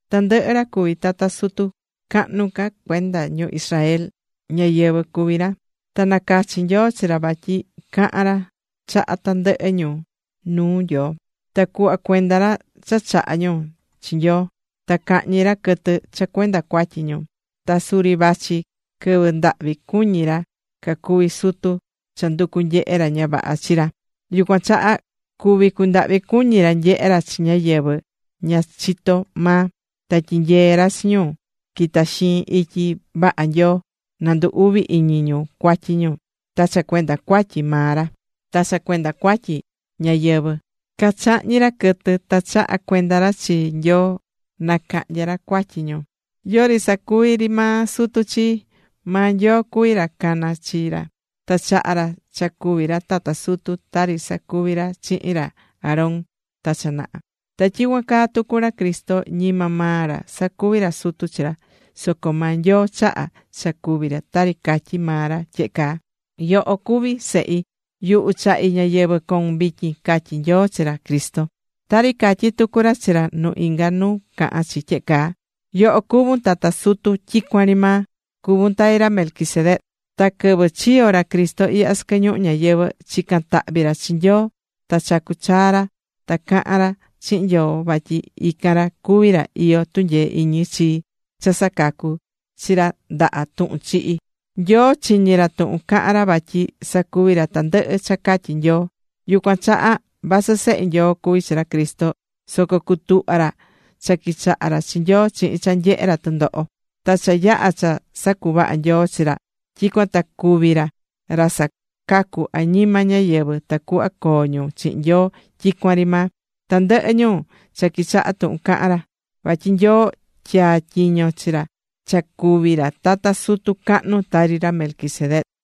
Tandɨhɨ ra cuví tata sutu cahnu ca cuenda ñu Israel, ñáyɨvɨ cuví ra. Ta na cachi̱ Nyoo chi ra vatyi cahan ra chaha tandɨhɨ ñu nuu Nyoo, ta cuhva cuenda ra cha chahá ñu chi Nyoo, ta cahñi ra quɨtɨ cha cuenda cuatyi ñu. Ta suri vachi quɨvɨ ndahvi cuñí ra cacuví sutu cha nducú nyehe ra ña vaha chi ra, yucuan chaha cuví cundahvi cuñi ra nyehé ra chi ñáyɨvɨ ña chitó maa, ta tyinyeé ra chi ñu quita̱ caxiin ityi vaha Nyoo, na ndu uvi iñi ñu cuatyi ñu. Ta cha cuenda cuatyi maa ra ta cha cuenda cuatyi ñáyɨvɨ, cachahñí ra quɨtɨ ta chahá cuenda ra chi Nyoo na cahnya ra cuatyi ñu. Yori sacuvi ri maa sutu chi. Maa Nyoo cuví ra cana̱ chi ra, ta chaha̱ ra cha cuvi ra tata sutu, tari sacuvi̱ ra chihin ra Aarón ta cha naha. Ta tyicuan caa tucu ra Cristo, ñima maa ra sacuvi̱ ra sutu chi ra, soco maa Nyoo chaha̱ cha cuvi ra, tari catyí maa ra tyehe caa: Yoho cuví Sehi. Yuhu chahí ñayɨvɨ̱ coun vityin, catyí Nyoo chi ra Cristo. Tari catyí tucu ra chi ra nu inga nu cahán chi tyehe caa: Yoho cuvún tata sutu tyicuan ri maa. Cuvún tari ra Melquisedec. Ta quɨvɨ chiyo̱ ra Cristo ihya sɨquɨ ñuhu ñayɨvɨ̱, chica̱n tahvi ra chi Nyoo, ta chacu̱ chaa ra ta caha̱n ra chihin Nyoo vatyi ican ra cuví ra iyó tunyee iñi chii cha sacacu̱ chi ra ndaha tuhun chihi. Ta Nyoo chiñi̱ ra tuhun caha̱n ra vatyi sacuvi̱ ra tandɨhɨ cha catyi̱ Nyoo. Yucuan chaha vasɨ Sehe Nyoo cuví chi ra Cristo, soco cutuhva̱ ra cha quichaha ra chi Nyoo chihin cha nyehe̱ ra tɨndoho. Ta cha yaha̱ cha sacuvaha̱ Nyoo chi ra, tyicuan ta cuvi̱ ra ra sacacú añima ñáyɨvɨ tacuhva coo ñu chihin Nyoo tyicuan ri maa, tandɨhɨ ñu cha quichahá tuhun cahán ra. Vatyi Nyoo tyaa̱ tyiño chi ra cha cuví ra tata sutu cahnu, tari ra Melquisedec.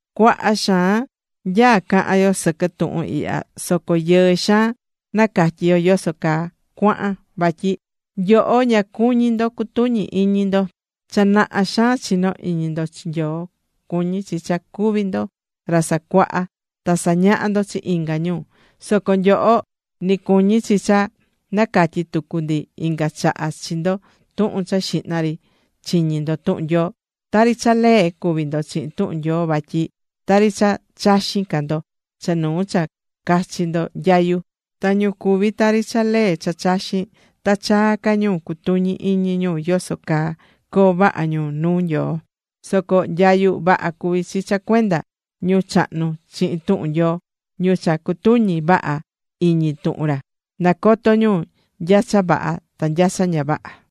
Cuaha xaan nyaá cahan yo sɨquɨ tuhun ihya, soco yɨɨ xaan nacatyí yoso caa cuahan, vatyi nyoho ña cuñí ndo cutuñi iñi ndo. Cha naha xaan chinó iñi ndo chi Nyoo, cuñí chi cha cuví ndo ra sacuahá ta sañaha ndo chi inga ñu. Soco nyoho ni cuñí chi cha nacatyí tucu ndi inga chaha chi ndo tuhun cha xihna ri chiñi̱ ndo tuhun Nyoo. Tari cha lee cuví ndo chihin tuhun Nyoo, vatyi tari cha chaxin ca ndo cha nuu cha cachi ndo nyayu. Ta ñu cuví tari cha lee cha chaxín, ta chaa ca ñu cutuñi iñi ñu yoso caa coo vaha ñu nuu Nyoo. Soco nyayu vaha cuví chi cha cuenda ñu chahnu chihin tuhun Nyoo: ñu cha cutuñí vaha iñi tuhun ra, nacotó ñu nya cha vaha ta nya cha ña vaha.